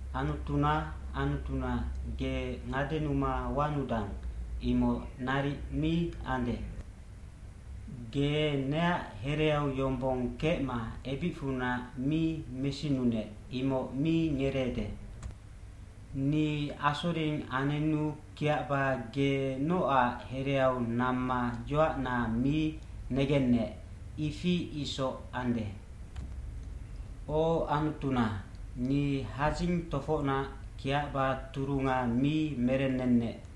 aAnutuna, Anutuna, ge ngadenuma wanudang, imoc naric mi ande. Ge neac hereau yombong kecma ebicfunac mi mesinunec, imoc mi ngereede. Ni asoring anenu kiacba ge nocac hereau namma yoacna mi negennec, ifi isoc ande. O Anutuna, ni hadzing tofocnac kiacba turunga mi merennennec,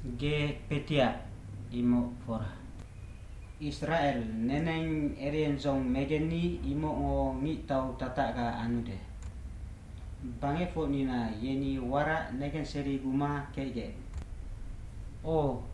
Ge kpetiac, imoc fora. Isracel neneng eriendzong megenni, imocngo ngictau tatacga anude. Bangecfocnina yeni warac negenseriguma kecgec. O,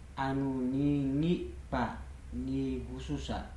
Anu ni ngic kpac, ni gususac.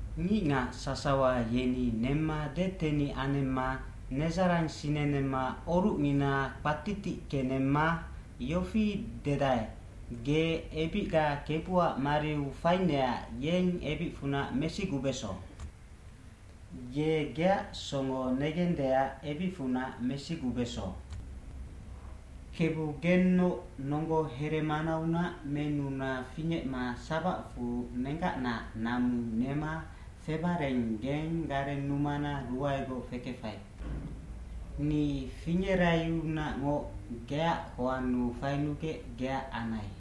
eNgicngac sasawa yeni nemma detenic anemma nedzarang sinenemma orucngina kpatitickenemma yofi dedae, f“Ge ebicga Kebuac mariu fainecac yeng ebicfunac mesigubeso. Ye geac songo negendeac ebicfunac mesigubeso.” Kebu gennoc nonggo heremanaunac menuna fingecma sabacfu nenggacnaac namu nema febareng geng garennumana ruaegoc fekefai.g Ni fingeraiunacngoc geac hoannu fainugec geac anai.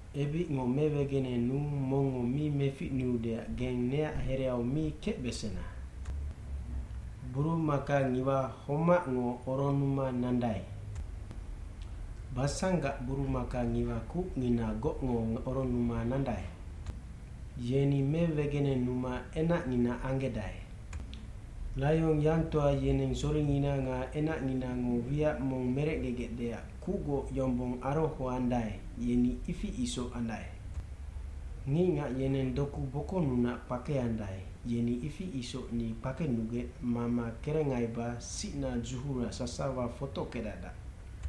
Ebicngo mewegenenuu mongngo mi meficnuudeac geng neac hereau mi kecbesena.i Burumakangiwa homacngo oronnuma nandae. Basangac burumakangiwa kucnginagocngo oronnuma nandae. Yeni mewegenenuma enacngina anggedae. Laionyangtoa yeneng soringina nga enacnginango wiac mong merecgegecdeac kucgoc yombong arohoandae, yeni ifi isoc andae. Ngicngac yeneng doku bokonnunac kpakeandae, yeni ifi isoc ni kpakenugec mama kerengaiba sicna dzuhura sasawa fotockedacdac.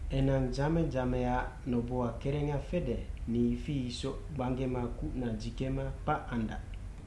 Enang dzame dzameaac noboha kerenga fede, ni ifi isoc gbanggema kucna dzikema kpac andac.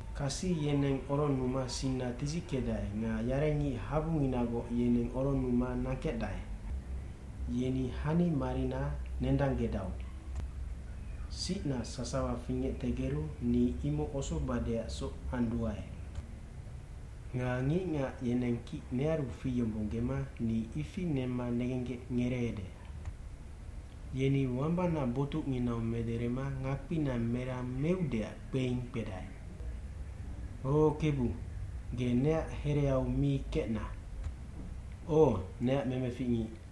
Kasi yeneng oronnuma sinna tidzickecdae nga yarengic habunginagoc yeneng oronnuma nangkecdae. Yeni hanimarina nendanggedau. Sicna sasawa fingectegeru ni imoc osobadeacsoc anduae. Nga ngicngac yeneng kic nearu fiyombonggema ni ifi nemma negenggec ngereede. lYeni wambana botucnginau mederema ngakpina merang meudeac kpeing kpedae. O Kebu, ge neac hereau mi kecna. O, neac memeficngic,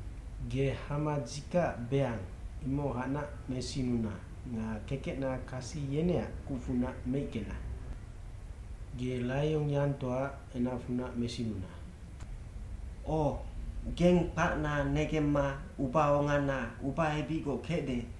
Ge hama dzikacac beang, imohacnac mesinuna nga kekecna kasi yeneac kucfunac meickena. Ge laionyangtoaac enacfunac mesinuna. O, geng kpacna negemma ubaongana ubaebicgoc kecde,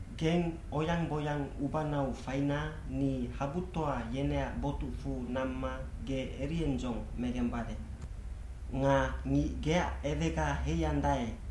Geng oyang boyang ubanau faina ni habutoa yeneac botucfu namma ge eriendzong megembade. Nga ngic geac ewega heiandae,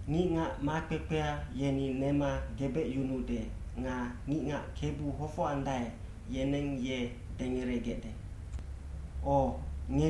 Ngicngac makpekpea yeni nema gebecyunuude nga ngicngac Kebu hofocandae, yeneng ye dengeregecde. O,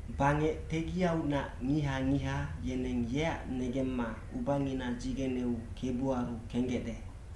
Bangec tegiaunac ngiha ngiha yeneng yeac negemma ubangina dzigeneu kebuaru kenggecde.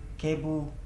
Kebu,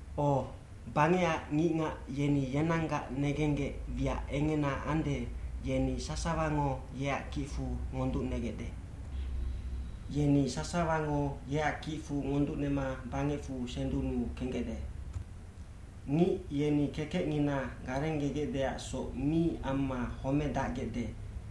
O, bangecac ngicngac yeni yenanggac ngenggec wiac engena ande, yeni sasawango yeac kicfu ngonducnegecde. Yeni sasawango yeac kicfu ngonducnema bangecfu sendunnu kenggecde. Ngic yeni kekecngina garenggegecdeacsoc mi amma homedacgecde,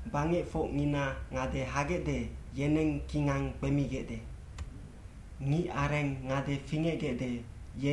Bangecfocngina ngade hagecde, yeneng kingang kpemigecde. Ngicareng ngade fingecgecde,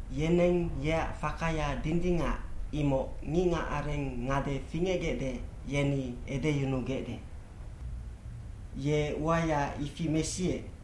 Yeneng yeac fakaya dindingac, imoc ngicngacareng ngade fingecgecde, yeni edeyunugecde. Ye uaya ifi mesiec,